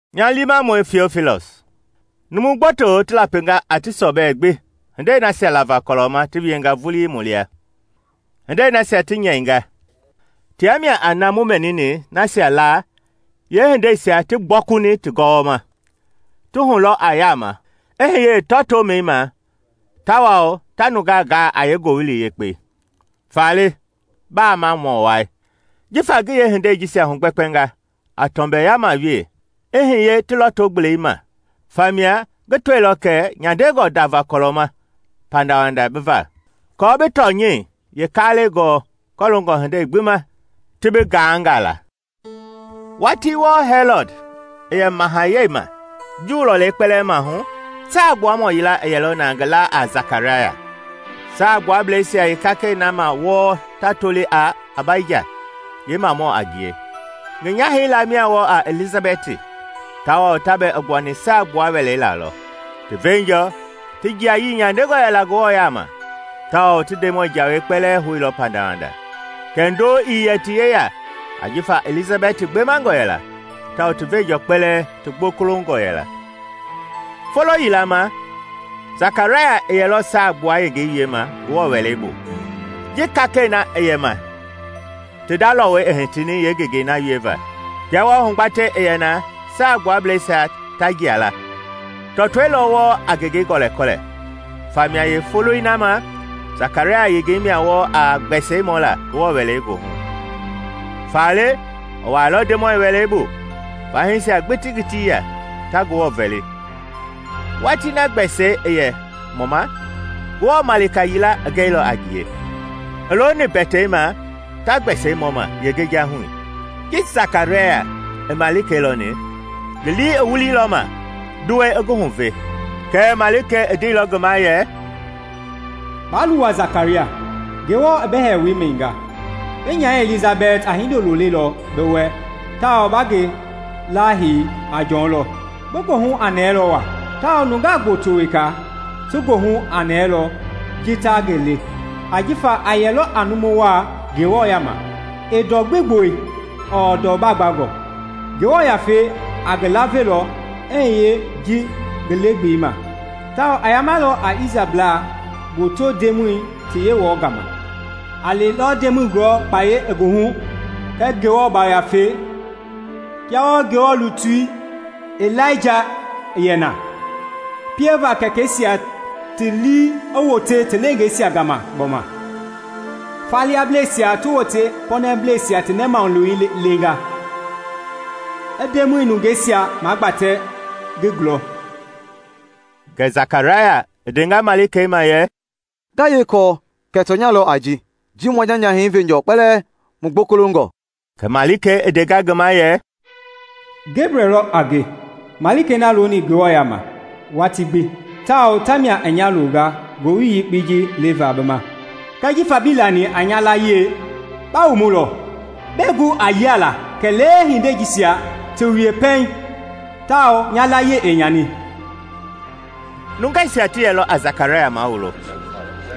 Nya liimamɔi Tiofilɔs, Numu gboto ti lapinga a ti sɔbɛ gbi hindei nasia lava kɔlɔ ma ti wienga vulii mu lia. Hindei nasia ti nyɛinga, tia mia a na mu mɛnini nasia laa yeehindeisia ti gbɔkuni ti gɔwɔma, ti hulɔ a yama i hiye yeetɔtoomɛi ma tawao ta nungaa gaa a yeengowili yekpei. Faale, Bamamɔ Wai, jifa ngi yeehindei jisia hugbɛkpɛnga a tɔmbɛyama wee i hiye ti lɔto-gbelei ma, famia ngi tɔilɔ kɛ a nyandelɔ ndava kɔlɔ ma pandawanda bi va, aako bi tɔnyɛi yee kaalɛi gɔɔ kɔloongɔ hindei gbi ma ti bi ganga la. Watii wɔɔ Hɛlɔd i yɛ mahayɛi ma Juu lɔlei kpɛlɛɛ mahu, saa Gbuamɔ yila i yɛlɔ na ngi laa a Sakaraya, Saa Gbuablɛisia yeekakɛi na wɔɔ ta toli a Abaija yeemamɔ a ngie. Ngi nyahɛi laa mia wɔɔ a Ilizabɛti; tawao ta bɛɛ i gbuani saa gbua wɛlei la lɔ. Ti veenjɔ ti jiayii nyandengɔ yɛla Ngewɔ yama, tawao ti Ndemɔi jawei kpɛlɛɛ houilɔ pandawanda. Kɛɛ ndo ii yɛ ti yeya ajifa Ilizabɛti gbemangɔ yɛla, tawao ti veenjɔ kpɛlɛɛ ti gbokolongɔ yɛla. Folo yila ma Sakaraya i yɛlɔ Saa Gbua yengei wiema Ngewɔ Wɛlei bu, ji kakɛi na i yɛ ma ti nda lɔwɔi i hitini yeengengei na wieva. Kia wɔɔ hugbatei i yɛ na Saa Gbuablɛisia ta jia la, tɔtɔi lɔ wɔɔ a ngengei gɔlɛkɔlɛ, famia yeefoloi na ma, Sakaraya yengei mia wɔɔ a gbɛsɛi mɔla Ngewɔ Wɛlei goohu. Faale i wuailɔ Ndemɔi Wɛlei bu, fahiisia gbi ti ngiti ya, ta Ngewɔ vɛli, watii na gbɛsɛi i yɛ mɔma. Ngewɔ malika yila i gɛilɔ a ngie, i looni mbɛtei ma ta gbɛsɛi mɔ ma yeengejahui. Ji Sakaraya i malikei lɔni, ngi lii i wuliilɔ ma, nduwɛi i ngi huve. Kɛɛ malikei i ndeilɔ ngi ma yɛ, “Baa luwa, Sakaraya! Ngewɔ i bi hɛɛwoi mɛninga, bi nyahɛi Ilizabɛti a hindolo lelɔ bi wɛ tawao ba ngi lɛi hei a Jɔn lɔ. Bi goohu a nɛɛlɔ waa tawao nungaa gboto weka ti goohu a nɛɛlɔ ji ta ngi le; ajifa a yɛlɔ a numu waa Ngewɔ yaama. Ɛɛ ndɔ gbi gboli ɔɔ ndɔ gbangɔ. Ngewɔ Yafei a ngi lavelɔ i hiye ngi le-gbelei ma, tawao a yamalɔ a Isrɛlblaa gboto Ndemɔi ti Yewɔɛi gama! A lilɔ Ndemɔi gulɔ kpaya i ngi hu kɛɛ Ngewɔ Yafei kia wɔɔ Ngewɔ lutui Ilaija i yɛ na, pieva kɛkɛisia ti lii i wote ti leengeisia gama gbɔma, faliablɛisia ti wote pɔɔnableisia ti nɛmahulewei leenga; i Ndemɔi nungeisia magbatɛ ngi gulɔ.” Kɛ Sakaraya i ndenga malikei ma yɛ, “Nga yee kɔɔ kɛ tɔnya lɔ a ji? Ji mua nya nyahɛi veenjɔ kpɛlɛɛ mu gbokolongɔ.” Kɛ malikei i ndenga ngi ma yɛ, “Gebrɛl lɔ a nge, malikei na i looni Ngewɔ yaama watii gbi, tawao tamia i nya longa ngowili yekpei ji leva bi ma. Kɛɛ jifa bii lani a nya layie, ba mumulɔ, bɛɛ gu a yialaa kɛlee hindei jisia ti wie pɛiŋ, tawao nya layie ɛɛ nyani.” Nungeisia ti yɛlɔ a Sakaraya mawulo,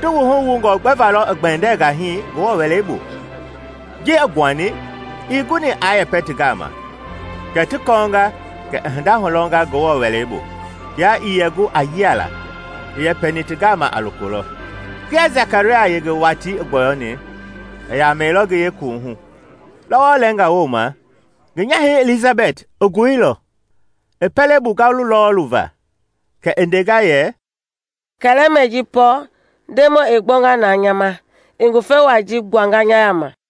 ti wuhu wungɔ gbɛva lɔ i gbɛndɛnga hii Ngewɔ Wɛlei bu. Ji i gbuani, ii guni aa yɛpɛ ti gama, kɛ ti kɔɔnga kɛ i hinda hulɔnga Ngewɔ Wɛlei bu. Kia ii yɛ gu a yialaa, i yɛpɛni ti gama a loko lɔ. Kia Sakaraya yenge watii i gbɔyɔni, i yamɛilɔ ngi yeekuwuhu. Lɔwɔ lɛɛnga wooma ngi nyahɛi Ilizabɛti i goilɔ, i pɛlei bu ngalu lɔɔlu va. Kɛ i ndenga yɛ, “Kɛlɛmɛi ji pɔɔ, Ndemɔi i gbɔnga na nya ma, i ngufe wai ji gbuanga nya yama!”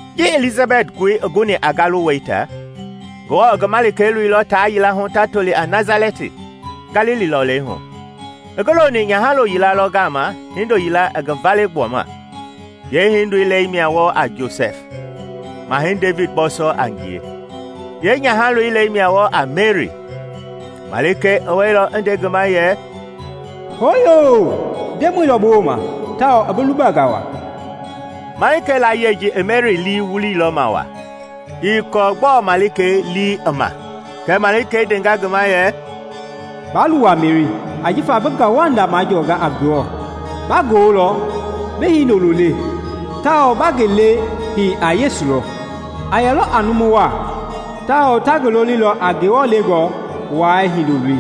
Ji Ilizabɛti goi i guni a ngalu wɛita, Ngewɔ i ngi malikei loilɔ taa yila hu ta toli a Nasalɛti, Galili lɔlei hu. I ngi loni nyahalo yila lɔ gama hindo yila i ngi vale gbuama. Yeehindoi lɛi mia wɔɔ a Josɛf, Mahɛi Devidi bɔɔsɔ a ngie. Yeenyahaloi lɛi mia wɔɔ a Meri. Malikei i wɛilɔ i nde ngi ma yɛ, “Hooyoo! Ndemɔi lɔ bi wooma tawao i bi lubanga wa!” Malikei layie ji i Meri lii wuliilɔ ma wa, ii kɔɔ gbɔɔ malikei lii i ma. Kɛ malikei ndenga ngi ma yɛ, “Baa luwa, Meri! Ajifa bi ngauwanda majɔnga a Ngewɔ. Ba goolɔ, bi Hindoloi le, tawao ba ngi lɛi hei a Yesu lɔ. A yɛlɔ a numu waa tawao ta ngi lolilɔ a Ngewɔ Lɛngɔ Wai ngi Hindoloi.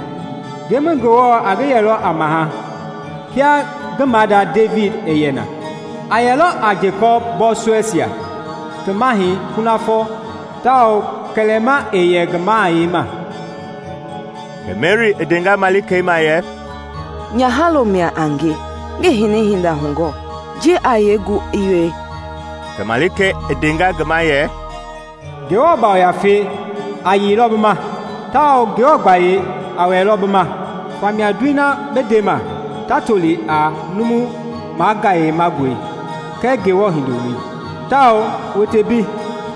Ndemɔi Ngewɔ a ngi yɛlɔ a maha, kia ngi maada Devidi i yɛ na. A yɛlɔ a Jekɔpi bɔɔsɔɛisia ti mahɛi kunafɔ tawao kɛlɛma ɛɛ yɛ ngi mahayɛi ma!” Kɛ Meri i ndenga malikei ma yɛ, “Nyahalo mia a nge, ngii hini hinda hugɔɔ, ji a yee gu i wie?” Kɛ malikei i ndenga ngi ma yɛ, “Ngewɔ Yafei a yeilɔ bi ma, tawao Ngewɔ gbayei a wɛlɛlɔ bi ma; famia ndoi na bi ndema ta tolilɔ a numu magayemangɔi kɛɛ Ngewɔ Hindoloi. Tawao, wote mbei,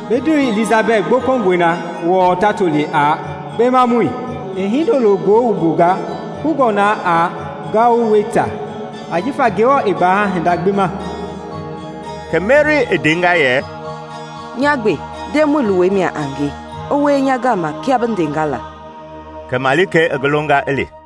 bi ndewei Ilizabɛti gbokolongɔi na wɔɔ ta toli a kpemamɔi, i hindoloo goo wumbunga kungɔ na a ngalu wɛita. Ajifa Ngewɔ ɛɛ gbaha hinda gbi ma.” Kɛ Meri i ndenga yɛ, “Nya gbe, Ndemɔi luwɔi mia a nge; i wie nya gama kia bi ndenga la.” Kɛ malikei i ngi longa i li.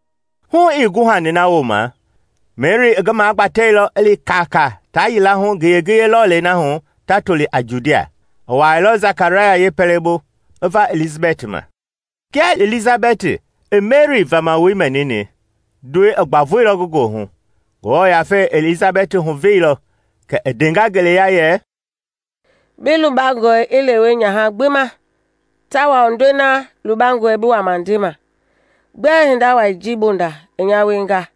Hu ii guhani na wooma, Meri i ngi magbatɛilɔ i li kaakaa taa yila hu ngiye-ngiye lɔlei na hu ta toli a Judia. I wuailɔ Sakaraya yeepɛlɛbu i va Ilizabɛti ma. Kia Ilizabɛti i Meri vamawoi mɛnini, ndoi i gbavoilɔ ngi goohu. Ngewɔ Yafei i Ilizabɛti huveilɔ kɛ i ndenga ngeleya yɛ, “Bi lubangɔe i lewe nyaha gbi ma tawao ndoi na lubangɔe bi wama ndema! Gbɛe hinda wai ji bonda i nya wienga,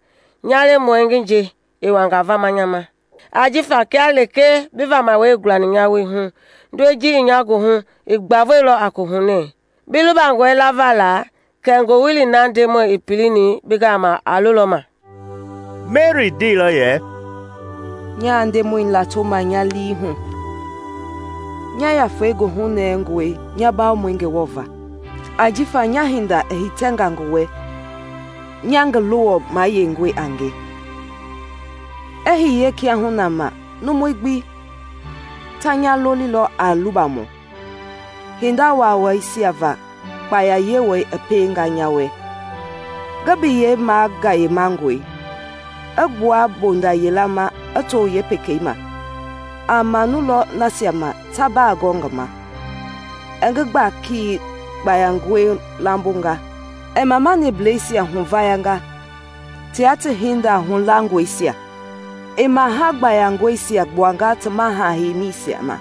nya lemɔi ngi nje i wanga vama nya ma? Ajifa kia lekee bi vamawoi i gulani nya woohu, ndoi ji i nya goohu i gbavoilɔ a kohunɛ. Bi lubangɔe lava la kɛ ngowili na Ndemɔi i pilini bi gama a lolɔ ma!” Meri ndeilɔ yɛ, “Nyaa Ndemɔi latoma nya lii hu; Nya yafei goohunɛngɔe nya Bawomɔi Ngewɔ va, ajifa nya hinda i hitɛnga ngi wɛ, nya ngi luwɔ mayeingɔi a nge! I hiye kiahuna ma numui gbi ta nya lolilɔ a lubamɔ, hinda waawaisia va kpaya Yewɔɛi i pienga nya wɛ. Ngi biyei magayemangɔe; I gbua mbonda yila ma i to yeepekei ma a manulɔ nasia ma ta bagɔɔ ngi ma. I ngi gbaki gbayangɔi lambonga i mamanibleisia huvayanga tia ti hinda hulangɔisia. I maha gbayangɔisia gbuanga ti maha-heimisia ma,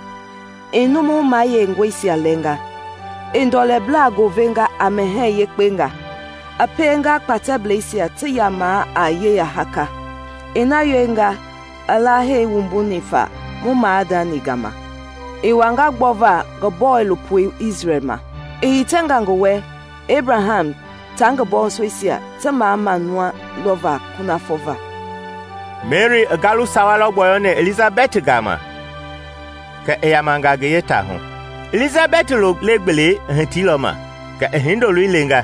i numu mayeingɔisia lɛnga. I ndɔlɛblaa goovenga a mɛhɛɛ yekpengaa i pienga kpatɛbleisia ti ya a yeya haaka. I na wienga i lahei wumbuni fa mu maadani gama i wanga gbɔva ngi bɔilopoi Isrɛl ma. I hitɛnga ngi wɛ Ebraham ta ngi bɔɔsɔɛisia ti mamamau lɔva kunafɔ va.” Meri i ngalu sawa lɔ gbɔyɔni Ilizabɛti gama kɛ i yamanga ngi yeetaahu. Ilizabɛti lo le-gbelei i hitiilɔ ma, kɛ i hindoloi lenga.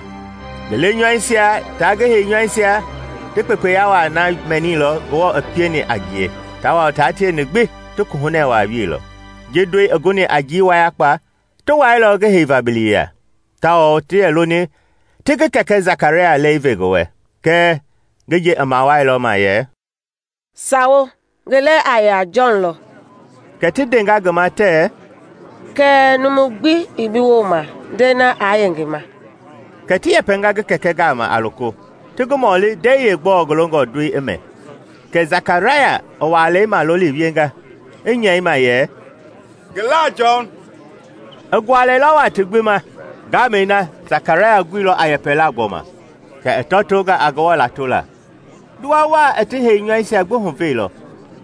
Ngi lenyɔuisia ta ngi heinyɔuisia ti kpekpeya wai na mɛnilɔ Ngewɔ i pieni a ngie, tawao tia tieni gbi ti kohunɛ wa wieilɔ. Ji ndoi i guni a njii wayakpa, ti wailɔ ngi heiva biliya, tawao ti yɛ loni ti ngi kɛkɛ Jakaraya lɛi ve ngi wɛ. Kɛɛ ngi nje i mawalilɔ yɛ, “Sawo! Ngi lɛi a yɛ a Jɔn lɔ.” Kɛ ti ndenga ngi ma tɛɛ, “Kɛɛ numu gbi ii bi wooma ndɛi na aa yɛ ngi ma.” Kɛ ti yɛpɛnga ngi kɛkɛ gama a loko, ti ngi mɔli ndɛi yeegbɔɔ ngi longɔ ndoi i mɛ. Kɛ Sakaraya i walei maloli wienga, i nyɛi ma yɛ, “Ngi la a Jɔn.” I gualɛilɔ wa ti gbi ma! Ngamɛi na Sakaraya i guilɔ a yɛpɛla gbɔma, kɛ i tɔtonga a Ngewɔ latola. Nduwa wa i ti heinyɔuisia gbi huveilɔ,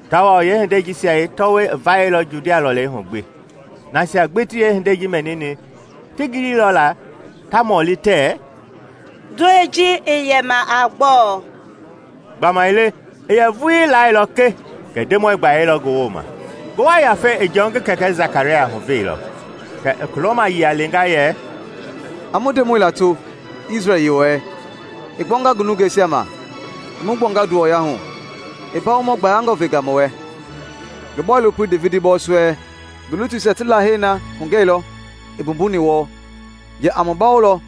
tawao yeehindei jisia yeetɔwɔi i vayɛilɔ Judia lɔlei hu gbi Nasia gbi ti yeehindei ji mɛnini ti giliilɔ la, ta mɔli tɛɛ, “Ndoi ji i yɛma a gbɔɔ?” Gbamaile i yɛ vuii lailɔ ke kɛ Ndemɔi gbayei lɔ ngi wooma. Ngewɔ Yafei i Jɔn ngi kɛkɛ Sakaraya huveilɔ, kɛ i kulɔmayia lenga yɛ: “A mu Ndemɔi lato, Isrɛl Yewɔɛi! I gbɔnga ngi nungeisia ma, i mu gbuanga nduwɔya hu. I Mbawomɔ gbayangɔ venga mu wɛ, ngi bɔilopoi Devidi bɔɔsɔɛi. Ngi lutuisia ti lahei na hugɛilɔ i mbumbuni wɔɔ yɛ a mu bawolɔ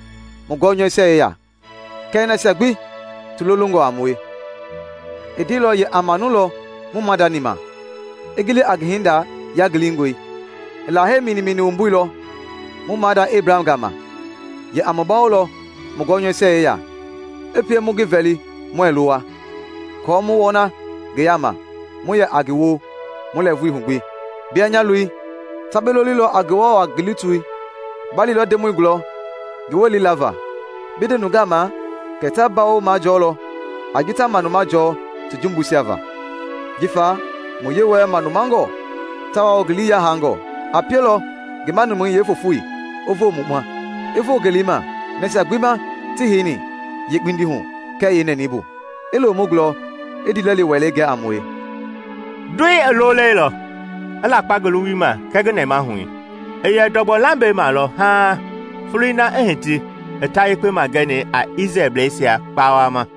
mu gɔnyɔuisia yeya, kɛɛ nasia gbi ti lolongɔ a mue. I ndeilɔ yɛ a manulɔ mu maadani ma, i gili a ngi hinda yangilingɔi. I lahei minimini wumbuilɔ mu maada Ebraham gama yɛ a mu bawolɔ mu gɔnyɔuisia yeya, i pie mu ngi vɛli muɛɛ luwa, aako mu wɔna ngi yama mu yɛ a ngi woo mu lɛɛvui hu gbi. “Bia, nya loi, ta bi lolilɔ a Ngewɔ Wa ngi lutui. Ba lilɔ Ndemɔi gulɔ ngi welei lava, bi nde nungaa ma kɛ ta mbawo majɔɔlɔ a ji ta manuma jɔɔ ti jumbuisia va. Jifa mu Yewɔɛi manumangɔ tawao ngi lii yahangɔ, a pielɔ ngi manumɛi yeefofoi i voo mu ma i voo ngelei ma nasia gbi ma ti heini hee yeekpindi hu kɛɛ yeenɛnɛi bu, i lo mu gulɔ i ndiilɛli welei gɛ a mue.” Ndoi i loolɛilɔ, i lakpa ngi luwui ma kɛɛ ngi nɛmahui. I yɛ ndɔgbɔ lambei ma lɔ haaŋ foloi na i hiti i ta yekpe magɛni a Isrɛlbleisia kpawama.